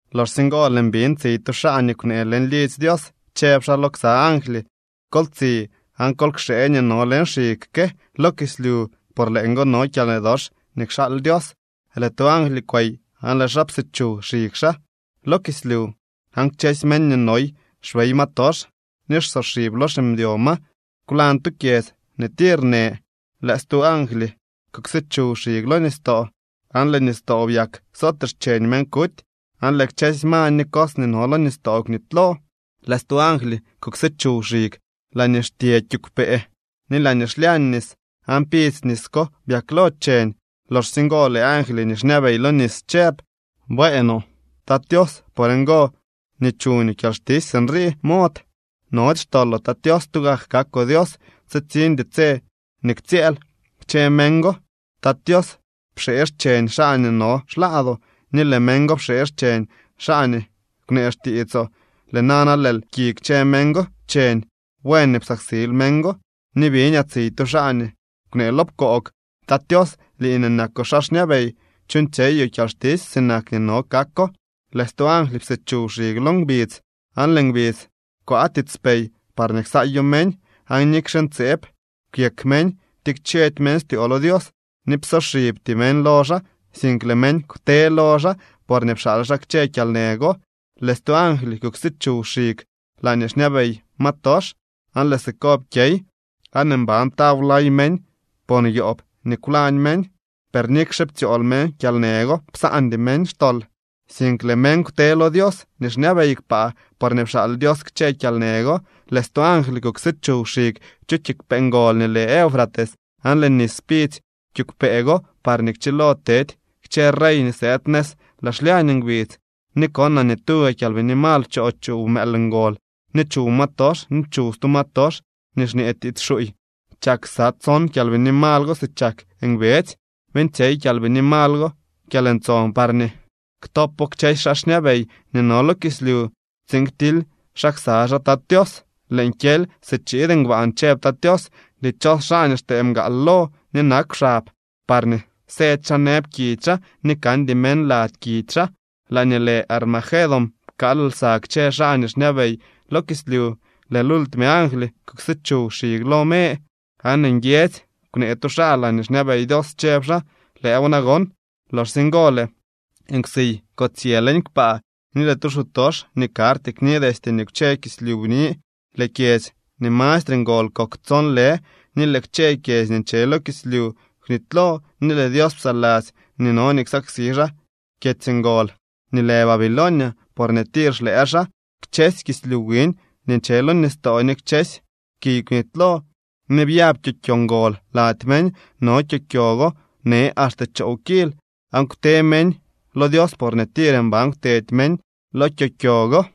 Loxsye ngo lëën biñ tsiy tu xaa nii kwnee leñ lidzy Dios, chëb xaa lo ksa angly: —Kol tsi aan kol kxee nii no leñ xig ke lo kislyu por leeñgo no kyalnë dox nii kxaal Dios. Lëë tu angly kwey aan lëë xaa psichuw xig xaa lo kislyu, aan kchësy meñ nii noy xbey ma tox ni xsoxib lo ximdyo ma kwlañ tu kyedz nii tir në. Lëë stu angly kuksichuw xig lo nistoo, aan lëë nistoo byak sootee xcheñ meñ kuty, aan lëë kchësy ma ni cos nii no lo nistoo kwnitylo. Lëë stu angly kuksichuw xig laañee xtye kiigwpee ni laañee xlyañ nis, aan pidzy nis ko byaklo cheñ. Loxsye ngo lëë angly nii xñabey lo nis chëb: —Bueenoo, Tat Tios. Por ngo nii chuñoo kyalxtisy sinrii mod. Nody xtoloo, Tat Tios. Tugak kakoo Dios. Tsitsiñdy tse nii ktsyëël. Kchë meñ go, Tat Tios, pxee xcheñ xaa nii no xlaadoo, ni lëë meñ go pxee xcheñ xaa nii kwnee xtiitsoo. Lëë nana lëël pki kchë meñ go cheñ. Buen nii psaksil meñ go. Ni biñaa tsiy tu xaa nii kwnee lo pkoog: —Tat Tios, lii nii nakoo xaa xñabey, chuuñtsyeyoo kyalxtisy sinak nii no kako. Lëë stu angly psichuw xig lo ngbidz, aan lëë ngbidz kwaa tiitspey parñee ksaayo meñ. Aan nikxe ntseeb kwyek meñ, ptikchedy meñ styoo lo Dios ni psoxibty meñ lo xaa, sink lëë meñ kwte lo xaa porñee pxaal xaa kchë kyalnë go. Lëë stu angly kuksichuw xig laañee xñabey ma tox, aan lëë siko pkyey. Aan mban taw lay meñ por yoob nii kwlañ meñ. Per nikxe ptsyool meñ kyalnë go, psaandy meñ xtol, sink lëë meñ kwte lo Dios nii xñabey kpaa, porñee pxaal Dios kchë kyalnë go. Lëë stu angly kuksichuw xig chu kiigwpee ngol nii lë Eufrates, aan lëë nis pidzy kiigwpee go parñee kchilo tedy kchë rey nii sëëd nëz laa xlyañ ngbidz. Ni konaa nii tuga kyalbini mal pchoo chuw mëël ngol ni chuw ma tox ni chuw stu ma tox nii xñee tiits xuuy. Chak ksa tson kyalbini mal go si chak ngbedzy. Beeñtsyey kyalbini mal go kyalntson parñee ktopo kchësy xaa xñabey nii no lo kislyu tsiin ktily xaa ksa xaa Tat Tios. —Lëën kyely si chiid ngbaan —chëb Tat Tios—. Dichos xaa nii xtee mgaal lo ni nakw xab, parñee sëdy xaa nëbkidy xaa ni kandy meñ lady kidy xaa. Laañee lë Armagedón pkaal lsa kchë xaa nii xñabey lo kislyu. Lëë lultime angly kuksichuw xig lo me, aan nguiedzy kwnee tu xaa laañee xñabey Dios, chëb xaa: —Lëëw nagon. Loxsye ngo lëë nkwsiy kotsyë leñ kpaa ni lëë tu xutox nii karty kni destye nii kwche kislyu bni. Lëë kyedzy nii mastre ngol kok tson lë, ni lëë kchë kyedzy nii nche lo kislyu kwnitylo ni lëë Dios psaladzy nii no nii ksaksi xaa kyedzy ngol nii lë Babilonia porñee tir xlëë xaa. Kchësy kislyu wiñ nii nche lo nistoo ni kchësy kiy kwnitylo. Ni byab kyokyo ngol lady meñ. No kyokyo go në axte choow kil. Aan kwte meñ lo Dios porñee tir mban kwtedy meñ lo kyokyo go.